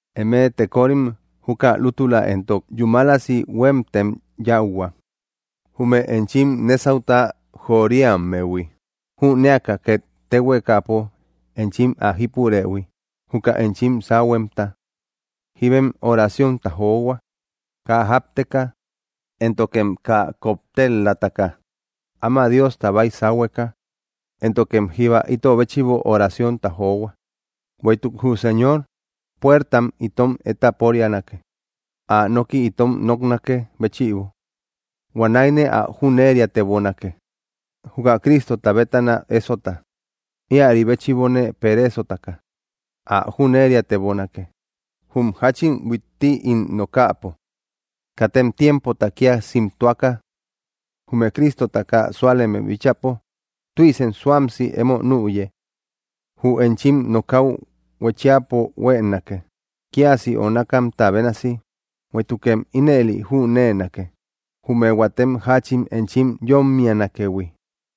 Emëe tekorim, juka lútula entok yúmalasi huémtem yáuhua, jume enchim nésauta joriammehui, jünéaka ket téhuekapo enchim ä jípurëhui, juka enchim sáhuemta. Jíbem oraciónta johua, kaa jápteka, éntokem kaa koptel-lataka, áma Diosta baisahueka. Éntokem jíba ito béchïbo oraciónta johua, bueïtuk jü Señor puertam itom étaporianake, ä noki itom noknakë béchïbo. Huanäine ä jüneriatebonake, juka Cristota bétana ésota. Íäri béchïbone pereesotaka ä jüneriatebonake, jum jáchin huitti ín nokäpo. Katem tiempota kia simtuaka, jume Cristota kaa súaleme bíchäpo tüisem suamsi emo nüye. Jü enchim nokäu huéchiapo huéenake, kiasi onakamta bénasi, bueïtukem ínëli jüneenake, jume huatem jáchin enchim yómmianakëhui.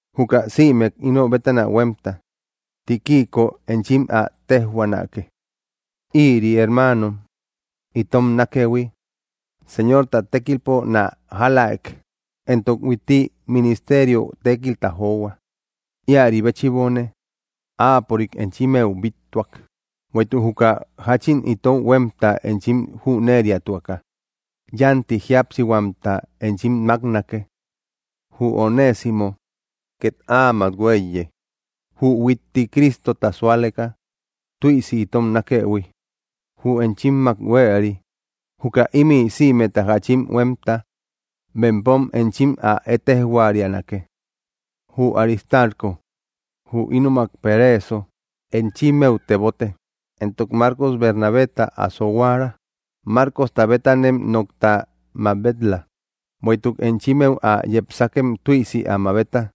Juka sïmek ino bétana huémta Tíquico enchim ä téjhuaanake. Ïri hermaano itom nákëhui Señorta tékilpo nä jálaek, entok huitti ministerio tékilta johua. Íäri béchïbone áapörik enchimmeu bíttuak, bueïtuk juka jáchin itou huémta enchim jüneriatuaka, yánti jíapsihuamta enchim máknake. Jü Onésimo két áamak huéiye, jü huitti Cristota súaleka tüisi itom nákëhui, jü enchimmak huéeri. Juka ímï sïmeta jáchin huémta bempom enchim ä ettejhuarianake. Jü Aristarco, jü ínomak pereeso, enchimmeu tebote, entok Marcos Bernabéta asohuara. Marcosta bétanem nokta mabet‑la, bueïtuk enchimmeu ä yepsakem tüisi ä mabeta.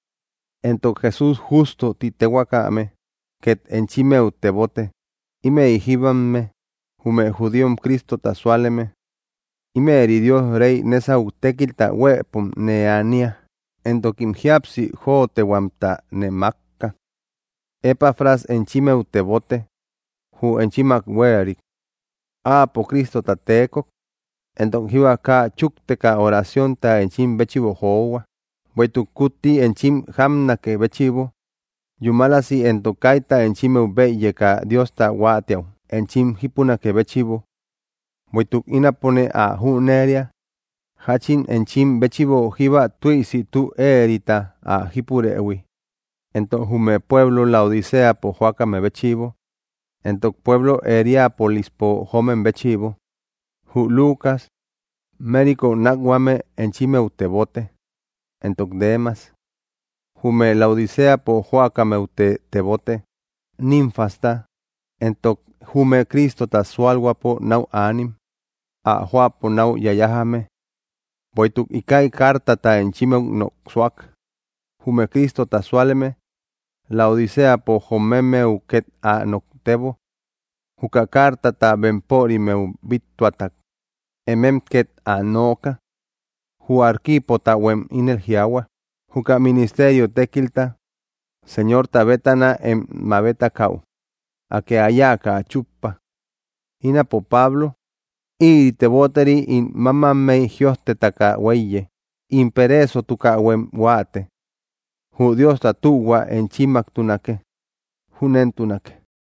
Entok Jesús Jústo ti téhuakame ket enchimmeu tebote. Ímëi jíbamme jume judíom Cristota súaleme. Ímëri Dios rey nésau tékilta huëpom nee ania, entokim jíapsi jóotehuamta nee mákka. Epafras enchimmeu tebote, jü enchimmak huéeri. Áapo Cristota teekok, entok jíba kaa chúkteka oraciónta enchim béchïbo johua, bueïtuk kutti enchim jápnakë béchïbo yúmalasi entok kaita enchimmeu bëyeka Diosta huáatiäu enchim jípunakë béchïbo. Bueïtuk ínapone ä jüneria jáchin enchim béchïbo jíba tüisi tü éerita ä jípurëhui, entok jume pueblo Laodiceapo jóakame béchïbo, entok pueblo Hierápolispo joomem béchïbo. Jü Lucas mériko nákhuame enchimmeu tebote, entok Demas. Jume Laodiceapo jóakammeute tebote, Nínfasta, entok jume Cristota sualhuäpo nau anim ä jóapo náu yayajame. Bueïtuk íkäi cartata enchimmeu noksuak, jume Cristota súaleme Laodiceapo jomemmehuem ket ä noktebo. Juka cartata bempörimmeu bíttuata, emem ket ä nooka. Jü Arquipotahuem ínel jiaahua: “Juka ministerio tékilta Señorta bétana em mabetakäu, Akë ä yáaka ä chúppa.” Ínapo Pablo; ïri teboteri ín mámammey jïojtetaka huéiye. In pereesotukähuem huáate. Jü Diosta tühua enchimmaktunake. Júnentunake.